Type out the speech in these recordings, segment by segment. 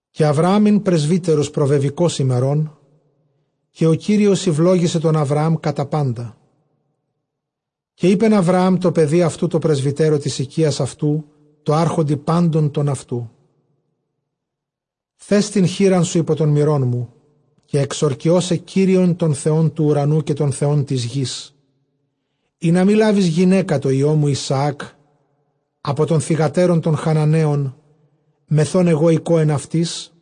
Καὶ Ἁβραὰμ ἦν πρεσβύτερος προβεβηκὼς ἡμερῶν· καὶ Κύριος ηὐλόγησε τὸν Ἁβραὰμ κατὰ πάντα. Καὶ εἶπεν Ἁβραὰμ τῷ παιδὶ αὐτοῦ τῷ πρεσβυτέρῳ τῆς οἰκίας αὐτοῦ, τῷ ἄρχοντι πάντων τῶν αὐτοῦ, θὲς τὴν χεῖρά σου ὑπὸ τὸν μηρόν μου. Καὶ ἐξορκιῶ σε Κύριον τὸν Θεὸν τοῦ οὐρανοῦ καὶ τὸν Θεὸν τῆς γῆς, ἵνα μὴ λάβῃς γυναῖκα τῷ υἱῷ μου Ἰσαὰκ ἀπὸ τῶν θυγατέρων τῶν Χαναναίων, μεθʼ ὧν ἐγὼ οἰκῶ ἐν αὐτοις.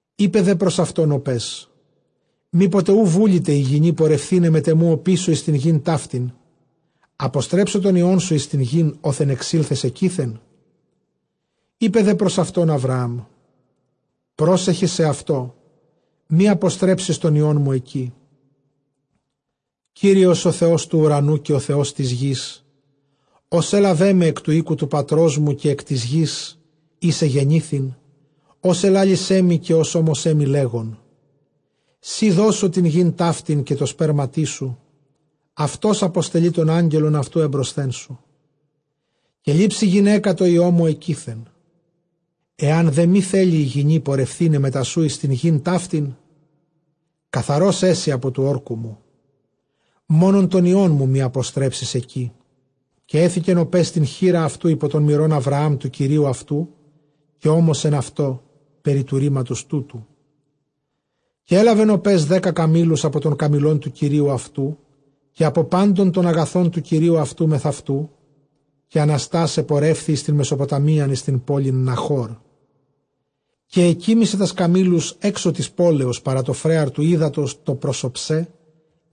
Εἶπε δὲ πρὸς αὐτὸν ὁ παῖς, μή ποτε οὐ βούληται ἡ γυνὴ πορευθῆναι μετʼ ἐμοῦ ὀπίσω εἰς τὴν γῆν ταύτην, ἀποστρέψω τὸν υἱόν σου εἰς τὴν γῆν, ὅθεν ἐξῆλθες ἐκεῖθεν; Εἶπε δὲ πρὸς αὐτὸν Ἁβραάμ, πρόσεχε σεαυτῷ μὴ ἀποστρέψῃς τὸν υἱόν μου ἐκεῖ. Κύριος ὁ Θεὸς τοῦ οὐρανοῦ καὶ ὁ Θεὸς τῆς γῆς, ὃς ἔλαβέ με ἐκ τοῦ οἴκου τοῦ πατρός μου, καἰ ἐκ τῆς γῆς ἧς ἐγεννήθην, ὃς ἐλάλησέ μοι, καὶ ὃς ὤμοσέ μοι, λέγων, σοὶ δώσω τὴν γῆν ταύτην καὶ τῷ σπέρματί σου, αὐτὸς ἀποστελεῖ τὸν Ἄγγελον αὐτοῦ ἔμπροσθέν σου, καὶ λήψῃ γυναῖκα τῷ υἱῷ μου ἐκεῖθεν. Ἐὰν δὲ μὴ θέλῃ ἡ γυνὴ πορευθῆναι μετὰ σοῦ εἰς τὴν γῆν ταύτην, καθαρὸς ἔσῃ ἀπὸ τοῦ ὅρκου μου· μόνον τὸν υἱόν μου μὴ ἀποστρέψῃς ἐκεῖ. Καὶ ἔθηκεν ὁ παῖς τὴν χεῖρα αὐτοῦ ὑπὸ τὸν μηρὸν Ἁβραὰμ τοῦ κυρίου αὐτοῦ, καὶ ὤμοσεν αὐτῷ περὶ τοῦ ῥήματος τούτου. Καὶ ἔλαβεν ὁ παῖς δέκα καμήλους ἀπὸ τῶν καμήλων τοῦ κυρίου αὐτοῦ, καὶ ἀπὸ πάντων τῶν ἀγαθῶν τοῦ κυρίου αὐτοῦ μεθʼ ἑαυτοῦ· καὶ ἀναστὰς ἐπορεύθη εἰς τὴν Μεσοποταμίαν εἰς τὴν πόλιν Ναχώρ. Καὶ ἐκοίμησε τὰς καμήλους ἔξω τῆς πόλεως παρὰ τὸ φρέαρ τοῦ ὕδατος τὸ πρὸς ὀψέ,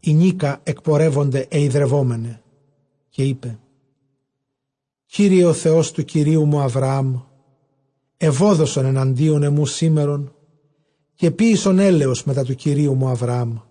ἡνίκα ἐκπορεύονται αἱ ὑδρευόμεναι. Καὶ εἶπε, Κύριε ὁ Θεὸς τοῦ κυρίου μου Ἁβραάμ, εὐόδωσον ἐναντίον ἐμοῦ σήμερον, καὶ ποίησον ἔλεος μετὰ τοῦ κυρίου μου Ἁβραάμ.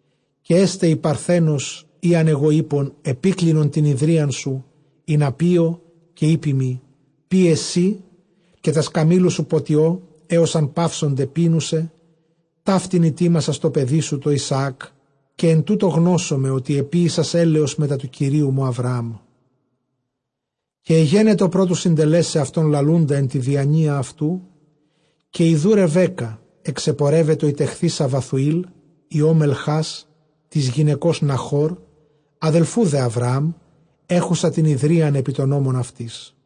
Καὶ ἔσται ἡ παρθένος ᾗ ἂν ἐγὼ εἴπω, ἐπίκλινον τὴν ὑδρίαν σου, ἵνα πίω, καὶ εἴπῃ μοι, πίε σύ, καὶ τὰς καμήλους σου ποτιῶ, ἕως ἂν παύσωνται πίνουσαι, ταύτην ἡτοίμασας τῷ παιδί σου τῷ Ἰσαάκ· καὶ ἐν τούτῳ γνώσομαι, ὅτι ἐποίησας ἔλεος μετὰ τοῦ κυρίου μου Ἁβραάμ. Καὶ ἐγένετο πρὸ τοῦ συντελέσαι αὐτὸν λαλοῦντα ἐν τῇ διανοίᾳ αὐτοῦ, καὶ ἰδοὺ Ῥεβέκκα ἐξεπορεύετο ἡ τεχθεῖσα Βαθουήλ, υἱῷ Μελχὰς τῆς γυναικὸς Ναχώρ, ἀδελφοῦ δὲ Ἁβραάμ, ἔχουσα τὴν ὑδρίαν ἐπὶ τῶν ὤμων αὐτῆς.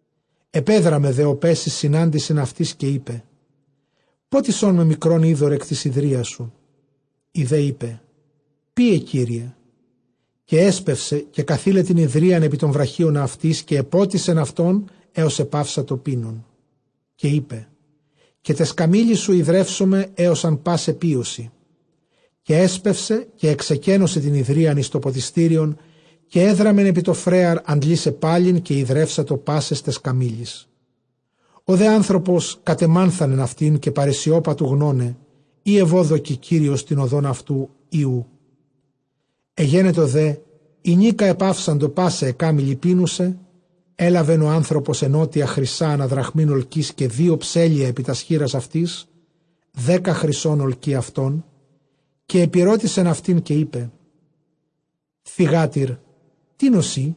Ἐπέδραμε δὲ ὁ παῖς εἰς συνάντησιν αὐτῆς, καὶ εἶπε, Πότισόν με μικρὸν ὕδωρ ἐκ τῆς ὑδρίας σου. Ἡ δὲ εἶπε, πίε, κύριε· καὶ ἔσπευσε καὶ καθεῖλε τὴν ὑδρίαν ἐπὶ τὸν βραχίονα αὐτῆς, καὶ ἐπότισεν αὐτὸν, ἕων ἐπαύσατο πίνων. Καὶ εἶπε, καὶ ταῖς καμήλοις σου ὑδρεύσομαι, ἕως ἂν πᾶσαι πίωσι. Καὶ ἔσπευσε καὶ ἐξεκένωσε τὴν ὑδρίαν εἰς τὸ ποτιστήριον· καὶ ἔδραμεν ἐπὶ τὸ φρέαρ ἀντλῆσαι πάλιν· καὶ ὑδρεύσατο πάσαις ταῖς καμήλοις. Ὁ δὲ ἄνθρωπος κατεμάνθανεν αὐτήν· καὶ παρεσιώπα τοῦ γνῶναι εἰ εὐώδωκε Κύριος τὴν ὁδὸν αὐτοῦ, ἢ οὔ. Ἐγένετο δὲ ἡνίκα ἐπαύσαντο πᾶσαι αἱ κάμηλοι πίνουσαι, ἔλαβεν ὁ ἄνθρωπος ἐνώτια χρυσᾶ ἀνὰ δραχμὴν ὁλκῆς, καὶ δύο ψέλλια ἐπὶ τὰς χεῖρας αὐτῆς, δέκα χρυσῶν ὁλκὴ αὐτῶν. Καὶ ἐπηρώτησεν αὐτὴν, καὶ εἶπε, θυγάτηρ τίνος εἶ;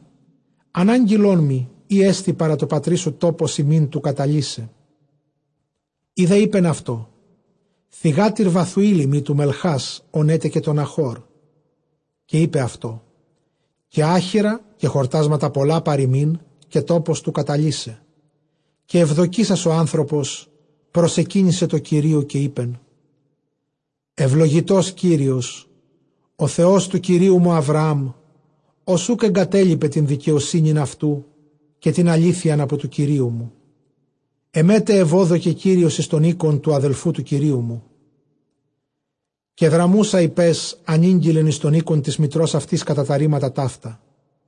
ἀνάγγειλόν μοι, εἰ ἔστι παρὰ τῷ πατρί σου τόπος ἡμῖν του καταλῦσαι. Ἡ δὲ εἶπεν αὐτῷ, θυγάτηρ Βαθουήλ εἰμι τοῦ Μελχάς, ὃν ἔτεκε τῷ Ναχώρ. Καὶ εἶπεν αὐτῷ, Καὶ ἄχυρα καὶ χορτάσματα πολλὰ παρʼ ἡμῖν, καὶ τόπος τοῦ καταλῦσαι. Καὶ εὐδοκήσας ὁ ἄνθρωπος προσεκύνησε τῷ Κυρίῳ Καὶ εἶπεν, εὐλογητὸς Κύριος ὁ Θεὸς τοῦ κυρίου μου Ἁβραάμ, ὃς οὐκ ἐγκατέλειπε τὴν δικαιοσύνην αὐτοῦ, καὶ τὴν ἀλήθειαν, ἀπὸ τοῦ κυρίου μου· ἐμὲ τʼ εὐώδωκε Κύριος εἰς οἶκον τοῦ ἀδελφοῦ τοῦ κυρίου μου. Καὶ δραμοῦσα ἡ παῖς ἀνήγγειλεν εἰς τὸν οἶκον τῆς μητρὸς αὐτῆς, κατὰ τὰ ῥήματα ταῦτα.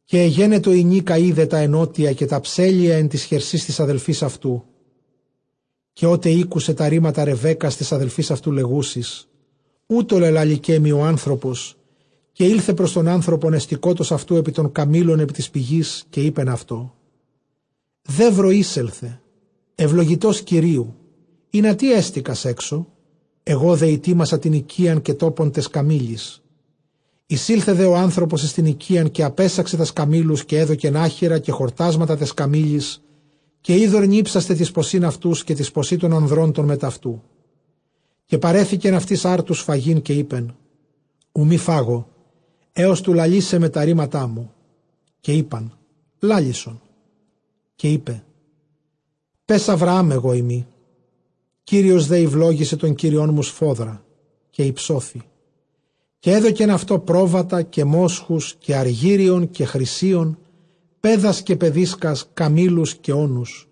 Καὶ ἐγένετο ἡνίκα εἶδε τὰ ἐνώτια, καὶ τὰ ψέλλια ἐν ταῖς χερσὶ τῆς ἀδελφῆς αὐτοῦ, καὶ ὅτε ἤκουσε τὰ ῥήματα Ῥεβέκκας τῆς ἀδελφῆς αὐτοῦ, λεγούσης, οὕτω λελάληκέ μοι ὁ ἄνθρωπος, καὶ ἦλθε πρὸς τὸν ἄνθρωπον, ἑστηκότος αὐτοῦ ἐπὶ τῶν καμήλων ἐπὶ τῆς πηγῆς. Καὶ εἶπεν αὐτῷ, δεῦρο εἴσελθε, εὐλογητὸς Κυροίυ· ἱνατί ἕστηκας ἔξω; ἐγὼ δὲ ἡτοίμασα τὴν οἰκίαν, καὶ τόπον ταῖς καμήλοις. Εἰσῆλθε δὲ ὁ ἄνθρωπος εἰς τὴν οἰκίαν, καὶ ἀπέσαξε τὰς καμήλους· καὶ ἔδωκεν ἄχυρα καὶ χορτάσματα ταῖς καμήλοις, καὶ ὕδωρ νίψασθαι τοῖς ποσὶν αὐτοῦ, καὶ τοῖς ποσὶ τῶν ἀνδρῶν τῶν μετʼ αὐτοῦ. Καὶ παρέθηκεν αὐτοῖς ἄρτους φαγεῖν· καὶ εἶπεν, οὐ μὴ φάγω, ἕως τοῦ λαλῆσαί με τὰ ῥήματά μου· καὶ εἶπεν, λάλησον. Καὶ εἶπε, παῖς Ἁβραὰμ ἐγώ εἰμι. Κύριος δὲ ηὐλόγησε τὸν κύριόν μου σφόδρα, καὶ ὑψώθη· καὶ ἔδωκεν αὐτῷ πρόβατα, καὶ μόσχους, καὶ ἀργύριον, καὶ χρυσίον, παῖδας, καὶ παιδίσκας, καμήλους, καὶ ὄνους.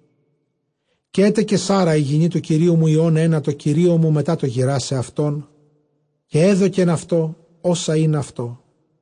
Καὶ ἔτεκε Σάῤῥα ἡ γυνὴ τοῦ κυρίου μου υἱὸν ἕνα τῷ κυρίῳ μου μετὰ τὸ γηράσαι αὐτόν· καὶ ἔδωκεν αὐτῷ ὅσα ἦν αὐτῷ.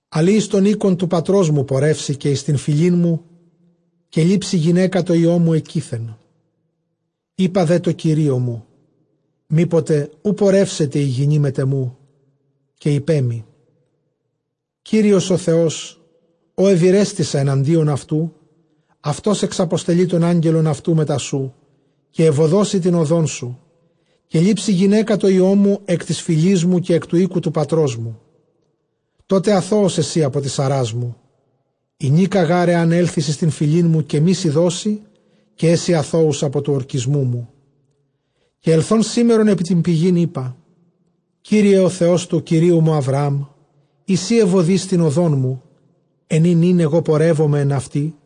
Ἀλλʼ εἰς τὸν οἶκον τοῦ πατρός μου πορεύσῃ, καὶ εἰς τὴν φυλήν μου, καὶ λήψῃ γυναῖκα τῷ υἱῷ μου ἐκεῖθεν. Εἶπα δὲ τῷ κυρίῳ μου, μήποτε οὐ πορεύσεται ἡ γυνὴ μετʼ ἐμοῦ. Καὶ εἶπέ μοι, Κύριος ὁ Θεὸς ᾧ εὐηρέστησα ἐναντίον αὐτοῦ, αὐτὸς ἐξαποστελεῖ τὸν Ἀγγελον αὐτοῦ μετὰ σοῦ, καὶ εὐοδώσει τὴν ὁδόν σου· καὶ λήψῃ γυναῖκα τῷ υἱῷ μου ἐκ τῆς φυλῆς μου, καὶ ἐκ τοῦ οἴκου τοῦ πατρός μου. Τότε ἀθῷος ἔσῃ ἀπὸ τῆς ἀρᾶς μου· ἡνίκα γὰρ ἐὰν ἔλθῃς εἰς τὴν φυλήν μου, καὶ μή σοι δῶσι, καὶ ἔσῃ ἀθῷος ἀπὸ τοῦ ὁρκισμοῦ μου. Καὶ ἐλθὼν σήμερον ἐπὶ τὴν πηγὴν εἶπα, Κύριε ὁ Θεὸς τοῦ κυρίου μου Ἁβραὰμ, εἰ σὺ εὐοδοῖς τὴν ὁδόν μου, ἐν ᾗ νῦν ἐγὼ πορεύομαι ἐν αὐτῇ,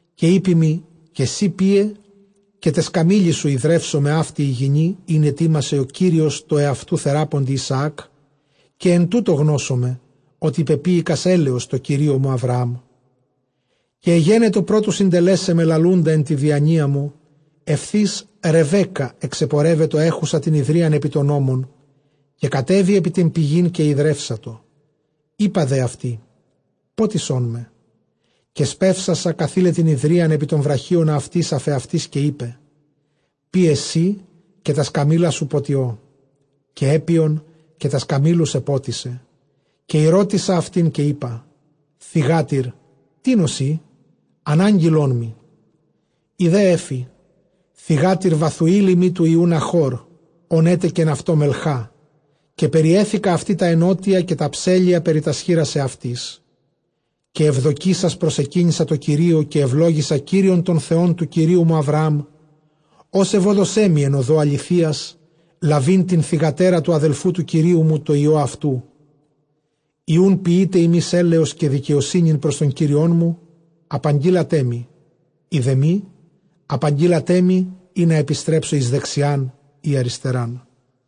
καὶ εἴπῃ μοι, καὶ σὺ πίε, καὶ ταῖς καμήλοις σου ὑδρεύσομαι, αὕτη ἡ γυνὴ ἣν ἡτοίμασε Κύριος τῷ ἑαυτοῦ θεράποντι Ἰσαάκ· καὶ ἐν τούτῳ γνώσομαι, ὅτι πεποίηκας ἔλεος τῷ κυρίῳ μου Ἁβραάμ. Καὶ ἐγένετο πρὸ τοῦ συντελέσαι με λαλοῦντα ἐν τῇ διανοίᾳ μου, εὐθὺς Ῥεβέκκα ἐξεπορεύετο, ἔχουσα τὴν ὑδρίαν ἐπὶ τῶν ὤμων· καὶ κατέβη ἐπὶ τὴν πηγὴν, καὶ ὑδρεύσατο· εἶπα δὲ αὐτῇ, πότισόν με. Καὶ σπεύσασα καθεῖλε τὴν ὑδρίαν ἐπὶ τὸν βραχίονα αὐτῆς ἀφʼ ἑαυτῆς, καὶ εἶπε, πίε σὺ, καὶ τὰς καμήλους σου ποτιῶ· καὶ ἔπιον, καὶ τὰς καμήλους ἐπότισε. Καὶ ἠρώτησα αὐτὴν, καὶ εἶπα, θυγάτηρ τίνος εἶ, ἀναγγειλόν μοι· ἡ δὲ ἔφη, θυγάτηρ Βαθουὴλ εἰμὶ υἱοῦ τοῦ Ναχὼρ, ὃν ἔτεκεν αὐτῷ Μελχά· καὶ περιέθηκα αὐτῇ τὰ ἐνώτια, καὶ τὰ ψέλλια περὶ τὰς χεῖρας αὐτῆς. Καὶ εὐδοκήσας προσεκύνησα τῷ Κυρίῳ, καὶ εὐλόγησα Κύριον τὸν Θεὸν τοῦ κυρίου μου Ἁβραὰμ, ὃς εὐώδωσέ με ἐν ὁδῷ ἀληθείας λαβεῖν τὴν θυγατέρα τοῦ ἀδελφοῦ τοῦ κυρίου μου τῷ υἱῷ αὐτοῦ. Εἰ οὖν ποιεῖτε ὑμεῖς ἔλεος καὶ δικαιοσύνην πρὸς τὸν κύριόν μου· εἰ δὲ μὴ, ἀπαγγείλατέ μοι, ἵνα ἐπιστρέψω εἰς δεξιὰν ἤ ἀριστεράν.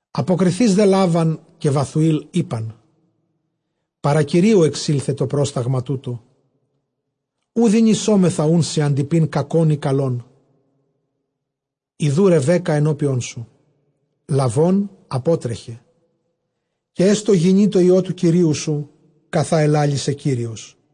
Ἀποκριθεὶς δὲ Λάβαν καὶ Βαθουὴλ εἶπαν, παρὰ κυρίου ἐξῆλθε τὸ πρᾶγμα τοῦτο· οὐ δυνησόμεθά σοι ἀντειπεῖν κακὸν ἢ καλόν. Ἰδοὺ Ῥεβέκκα ἐνώπιόν σου· λαβὼν ἀπότρεχε· καὶ ἔστω γυνὴ τῷ υἱῷ τοῦ κυρίου σου, καθὰ ἐλάλησε Κύριος.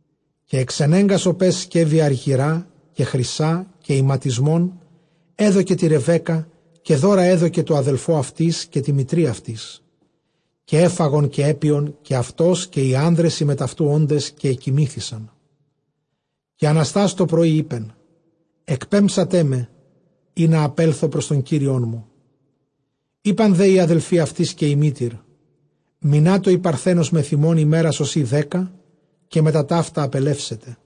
καὶ ἐξενέγκας ὁ παῖς σκεύη ἀργυρᾶ καὶ χρυσᾶ καὶ ἱματισμὸν, ἔδωκε τῇ Ῥεβέκκᾳ· καὶ δῶρα ἔδωκε τῷ ἀδελφῷ αὐτῆς, καὶ τῇ μητρὶ αὐτῆς. Καὶ ἔφαγον καὶ ἔπιον καὶ αὐτὸς καὶ οἱ ἄνδρες οἱ μετʼ αὐτοῦ ὄντες, καὶ ἐκοιμήθησαν· καὶ ἀναστὰς τὸ πρωῒ εἶπεν, ἐκπέμψατέ με, ἵνα ἀπέλθω πρὸς τὸν κύριόν μου. Εἶπαν δὲ οἱ ἀδελφοὶ αὐτῆς, καὶ ἡ μήτηρ, μεινάτω ἡ παρθένος μεθʼ ἡμῶν ἡμέρας ὡσεὶ δέκα, καὶ μετὰ ταῦτα ἀπελεύσεται.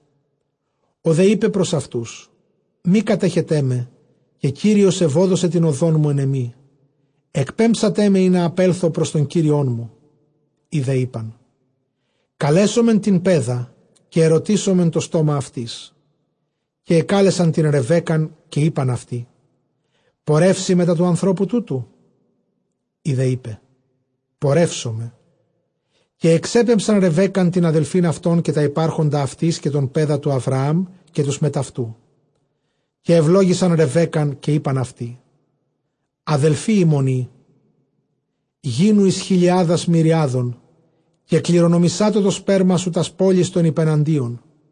Ὁ δὲ εἶπε πρὸς αὐτοὺς, μὴ κατέχετέ με· καὶ Κύριος εὐώδωσε τὴν ὁδόν μου ἐν ἐμοί· ἐκπέμψατέ με, ἵνα ἀπέλθω πρὸς τὸν κύριόν μου. Οἱ δὲ εἶπαν, Καλέσωμεν τὴν παῖδα, καὶ ἐρωτήσωμεν τὸ στόμα αὐτῆς. Καὶ ἐκάλεσαν τὴν Ῥεβέκκαν, καὶ εἶπαν αὐτῇ, πορεύσῃ μετὰ τοῦ ἀνθρώπου τούτου; ἡ δὲ εἶπε, πορεύσομαι. Καὶ ἐξέπεμψαν Ῥεβέκκαν τὴν ἀδελφὴν αὐτῶν, καὶ τὰ ὑπάρχοντα αὐτῆς, καὶ τὸν παῖδα τοῦ Ἁβραὰμ, καὶ τοὺς μετʼ αὐτοῦ. Καὶ εὐλόγησαν Ῥεβέκκαν, καὶ εἶπαν αὐτῇ, ἀδελφὴ ἡμῶν εἶ, γίνου εἰς χιλιάδας μυριάδων, καὶ κληρονομησάτω τὸ σπέρμα σου τὰς πόλεις τῶν ὑπεναντίων.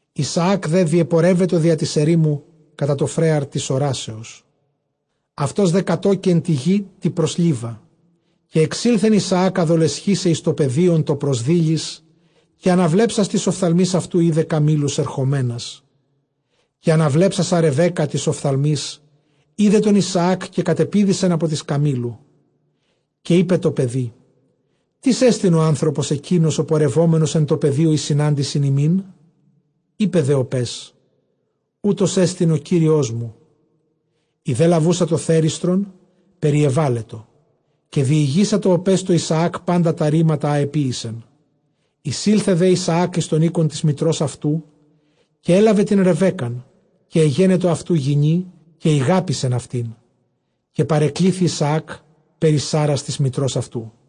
Ἰσαὰκ δὲ διεπορεύετο διὰ τῆς ἐρήμου κατὰ τὸ φρέαρ τῆς ὁράσεως· αὐτὸς δὲ κατῴκει ἐν τῇ γῇ τῇ πρὸς Λίβα. Καὶ ἐξῆλθεν Ἰσαὰκ ἀδολεσχῆσαι εἰς τὸ πεδίον τὸ πρὸς δείλης, καὶ ἀναβλέψας τοῖς ὀφθαλμοῖς αὐτοῦ εἶδε καμήλους ἐρχομένας. Καὶ ἀναβλέψασα Ῥεβέκκα τοῖς ὀφθαλμοῖς εἶδε τὸν Ἰσαάκ· καὶ κατεπήδησεν ἀπὸ τῆς καμήλου. Καὶ εἶπε τῷ παιδὶ, τίς ἐστιν ὁ ἄνθρωπος ἐκεῖνος ὁ πορευόμενος ἐν τῷ πεδίῳ εἰς συνάντησιν ἡμῖν; εἶπε δὲ ὁ παῖς, οὗτός ἐστιν ὁ κύριός μου· ἡ δὲ λαβοῦσα τὸ θέριστρον, περιεβάλετο. Καὶ διηγήσατο ὁ παῖς τῷ Ἰσαὰκ πάντα τὰ ῥήματα, ἃ ἐποίησεν. Εἰσῆλθε δὲ Ἰσαὰκ εἰς τὸν οἶκον τῆς μητρὸς αὐτοῦ, καὶ ἔλαβε τὴν Ῥεβέκκαν, καὶ ἐγένετο αὐτοῦ γυνὴ, καὶ ἠγάπησεν αὐτήν· καὶ παρεκλήθη Ἰσαὰκ περὶ Σάῤῥας τῆς μητρὸς αὐτοῦ.